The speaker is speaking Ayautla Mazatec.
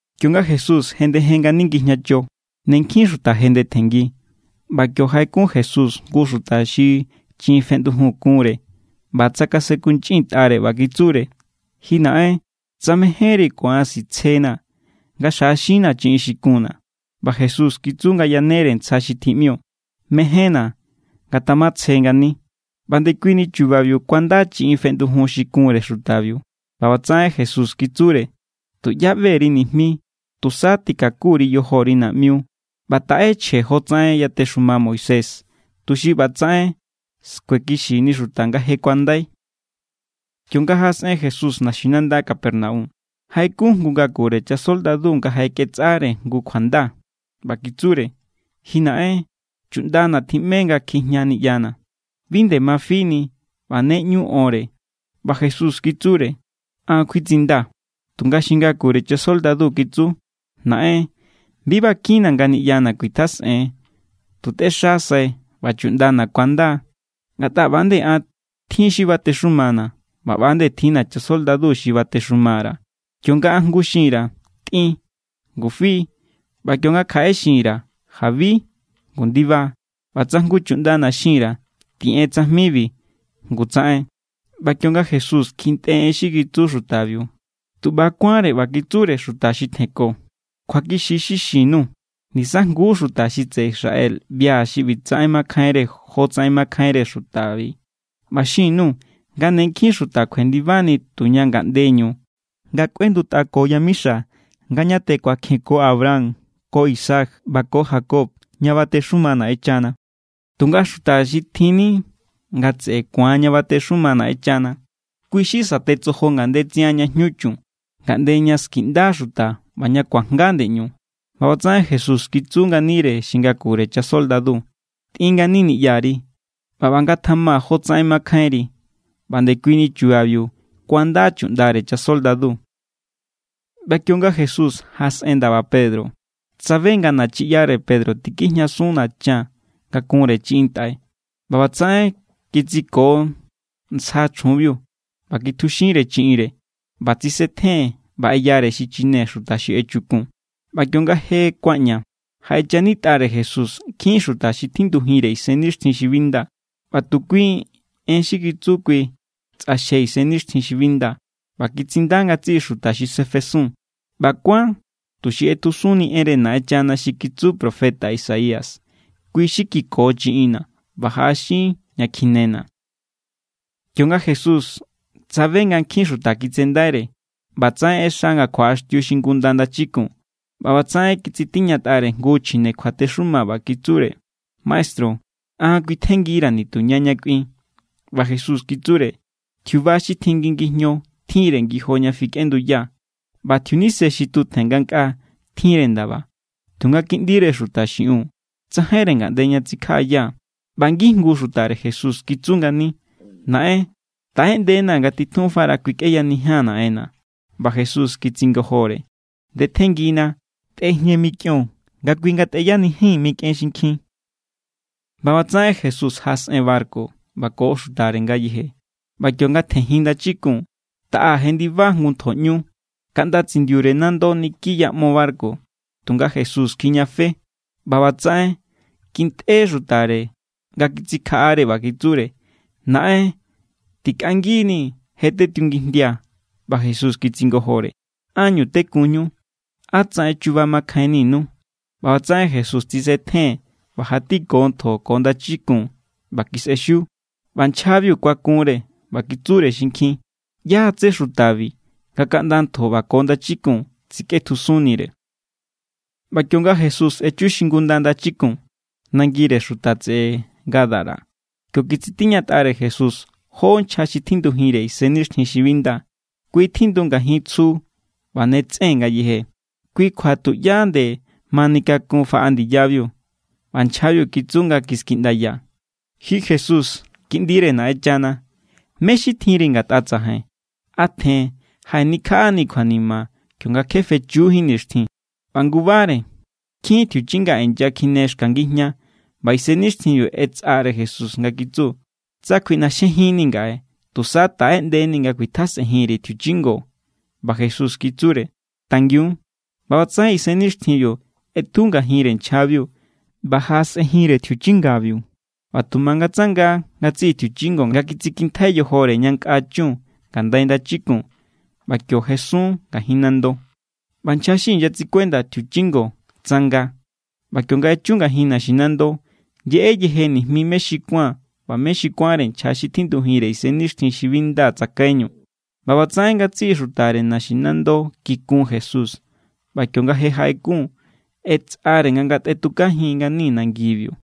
Kionga Jesús jendejen ngani ngijñacho, ne nkjin xuta jendetjenngi. ꞌBa kio jaꞌekun Jesús jngu xuta xi chiꞌin feꞌndujun kunre ꞌba tsakasenkunchꞌintꞌare ꞌba kitsure: —Ji naꞌen, tsa mejénri, ku̱an sitsjenaa̱ nga xjaꞌaxinnaa̱ chiꞌin xi kunna̱. ꞌBa Jesús kitsu nga yanere ntsja xi tjiꞌmio: —Mejénna̱. Ngatamatsje ngani. ꞌBa ndekui ni chubabiu kuanda chiꞌin feꞌndujun xi kunre xutabiu. ꞌBa ꞌbatsaꞌen Jesús kitsure: —Tuꞌyá ꞌbe_ri nijmi. Tusa tꞌikaku_ri yojori naꞌmiu ꞌba taꞌe chje jotsaꞌen yatexuma Moisés, tuxi ꞌba tsaꞌen skuekixini xuta nga je kuandai. Kionga jaꞌasꞌen Jesús naxinanda Capernaum, jaꞌekun jngu ngakure chasoldadu nga jaꞌeketsꞌare jngu kjuanda. ꞌBa kitsure: —Ji naꞌen, chuꞌndana̱ tjiꞌme nga kjijña niꞌyana̱. Bi nde ma fini ꞌba ne ꞌñu onre. ꞌBa Jesús kitsure: —An= kjuitsindaa̱. Tunga xi ngakure chasoldadu kitsu: —Naꞌen, bi bakinna̱ nga niꞌyana̱ kuitjasꞌen. Tu tꞌexasai ꞌba chuꞌndana̱ ku̱anda. Ngatꞌa ꞌba=nde an, tjin= xi batexumana̱ ꞌba ꞌba=nde tjinna̱ chasoldadu xi batexuma_ra̱. Kionga jngu xin_ra̱: “Tꞌin”, ngu fi. ꞌBa kionga kjaꞌere xin_ra̱ “Jabi”, ngu ndiba. ꞌBa tsa jngu chuꞌndana̱ xin_ra̱: “Tiꞌen tsajmibi”, ngu tsaꞌen. ꞌBa kionga Jesús kjintꞌe en xi kitsu xutabiu, tu ꞌba= kuánre ꞌba kitsure xuta xi tjenko: —Kjuakixi= xi xin_nuu̱. Nisajnguú xuta xi tseꞌe Israel ꞌbia̱ xi ꞌbitsaꞌen makjainre jotsaꞌen makjainre xutabi. ꞌBa xin_nuu̱ nga ne nkjin xuta kjuendibani tuña ngaꞌndeñu nga kꞌuendutꞌako yamixa nga ñatjen kuakjenko Abraham ko Isaac ꞌba ko Jacob ña batexuma Naꞌenchana. Tunga xuta xi tjinni nga tseꞌe ku̱an ña batexuma Naꞌenchana, kui= xi satetsojo ngandetsian ñá jñu chun, ngaꞌnde ña skiꞌnda xuta ꞌba ña kuajnga ndeꞌñu. ꞌBa ꞌbatsaꞌen Jesús kitsu nganire xi ngakure chasoldadu: —Tꞌin ngani niꞌyari, ꞌba ꞌba ngatjama jotsaꞌen mankjainri. ꞌBa ndekuini chubabiu kuanda chuꞌndare chasoldadu. ꞌBa kionga Jesús jaꞌasꞌen ndaba Pedro, tsabe nga nachiꞌyare Pedro tikjijñasun nachan nga kunre chiꞌin ntꞌai. ꞌBa ꞌbatsaꞌen kitsiko ntsja chjunbiu, ꞌba kitjuxinre chiꞌinre, ꞌba tsisetjen ꞌba ꞌeyare xichine xuta xi echukun. ꞌBa kionga je kuaꞌña, jaꞌechanitꞌare Jesús nkjin xuta xi tjindujinre isennixtjin xi bi nda. ꞌBa tu kui en xi kitsu kui tsꞌaxje isennixtjin xi bi nda, ꞌba kitsinda ngatsiꞌi xuta xi sefesun. ꞌBa kuán tuxi ꞌetjusunni enre Naꞌenchana xi kitsu profeta Isaías: “Kui= xi kiko chiꞌinna ꞌba jaꞌaxin ña kjinena.” Kionga Jesús tsabe nga nkjin xuta kitsendaire, ꞌbatsaꞌen ꞌexa nga kjuaꞌaxtiu xingunda ndachikun. ꞌBa ꞌbatsaꞌen kitsitiñatꞌare jngu chjine kjuatexuma ꞌba kitsure: —Maestru, an kjuitjenngira̱ nituña ña kꞌuin. ꞌBa Jesús kitsure: —Tjiuba xi tjin ngi ngijño tjinre ngijo ña fikꞌenduya, ꞌba tjiunise xi tutjen ngankꞌaa tjinre ndaba. Tunga Kiꞌndire Xuta xiꞌiun, tsajainre ngaꞌnde ña tsikjaꞌaya. ꞌBa ngijngu xutare Jesús kitsu ngani: —Naꞌen, taꞌeꞌndena nga titjunfara kuikꞌeyanijia̱n naꞌenna̱. ꞌBa Jesús kitsingojore: —Ndetjenngina. Tꞌejñe mikꞌion nga kui ngatꞌeyanijin mikꞌen xinkjin. ꞌBa ꞌbatsaꞌen Jesús jaꞌasꞌen barku, ꞌba ko xutare ngayeje. ꞌBa kionga tjenjin ndachikun taꞌa jendiba jngu ntjoꞌñu, kaꞌnda tsindiure nando niki yaꞌmo barku. Tunga Jesús kjijñafe. ꞌBa ꞌbatsaꞌen kintꞌe xutare nga kitsikjaꞌare ꞌba kitsure: —¡Naꞌen, tikꞌanginii̱! ¡Je tetiungijndia! ꞌBa Jesús kitsingojore: —¿Ánñu tekunñu? ¡Á tsaꞌen chuba makjainninu! ꞌBa ꞌbatsaꞌen Jesús tsisetjen ꞌba jatiko ntjo ko ndachikun, ꞌba kisꞌexiu. ꞌBa nchjabiu kuakunre ꞌba kitsure xinkjin: —¿ꞌYá= tsé xutabi nga kaꞌnda ntjo ꞌba ko ndachikun tsikꞌetjusunnire? ꞌBa kionga Jesús echu xingunda ndachikun, nangire xuta tseꞌe Gadara, kio kitsitiñatꞌare Jesús jó nchja xi tjindujinre isennixtjin xi bi nda. Kui tjindu ngajin tsju ꞌba ne tsꞌen ngayeje, kui kjua tuꞌyá nde manikakun faꞌa ndiyabiu. ꞌBa nchjabiu kitsu nga kiskjiꞌndaya: —Ji Jesús, Kiꞌndire Naꞌenchana, ¿mé= xi tjinri ngatꞌa tsajain? ¿A tjen jaꞌenikjaꞌanii̱ kjuanima kionga kje fechujín nixtjin? ꞌBa ngubare nkjin tjiuchinga inyakjine xka ngijña. ꞌBa isennixtjinbiu ꞌetsꞌare Jesús nga kitsu: —Tsa kuiꞌnaxjejinnii̱ ngaꞌe, tusa taꞌeꞌndenii̱ nga kuitjasꞌenjin_ri̱ tjiuchingo. ꞌBa Jesús kitsure: —Tangiun. ꞌBa ꞌbatsaꞌen isennixtjinbiu ꞌetju ngajinre nchjabiu ꞌba jaꞌasꞌenjinre tjiuchingabiu. ꞌBa tu mangatsanga ngatsiꞌi tjiuchingo nga kitsikintjai yojore ña nkꞌa chun ngandai ndachikun, ꞌba kio jesun ngajin nando. ꞌBa nchja xi inyatsikuenda tjiuchingo, tsanga. ꞌBa kionga echu ngajin naxinando, yeꞌe yeje nijmi mé xi kuán ꞌba mé xi kuánre nchja xi tjindujinre isennixtjin xi bi nda tsakaiñu. ꞌBa ꞌbatsaꞌen ngatsiꞌi xutare naxinando kikun Jesús. ꞌBa kionga je jaꞌekun, ꞌetsꞌare nga ngatꞌetjujin ngani nangibiu.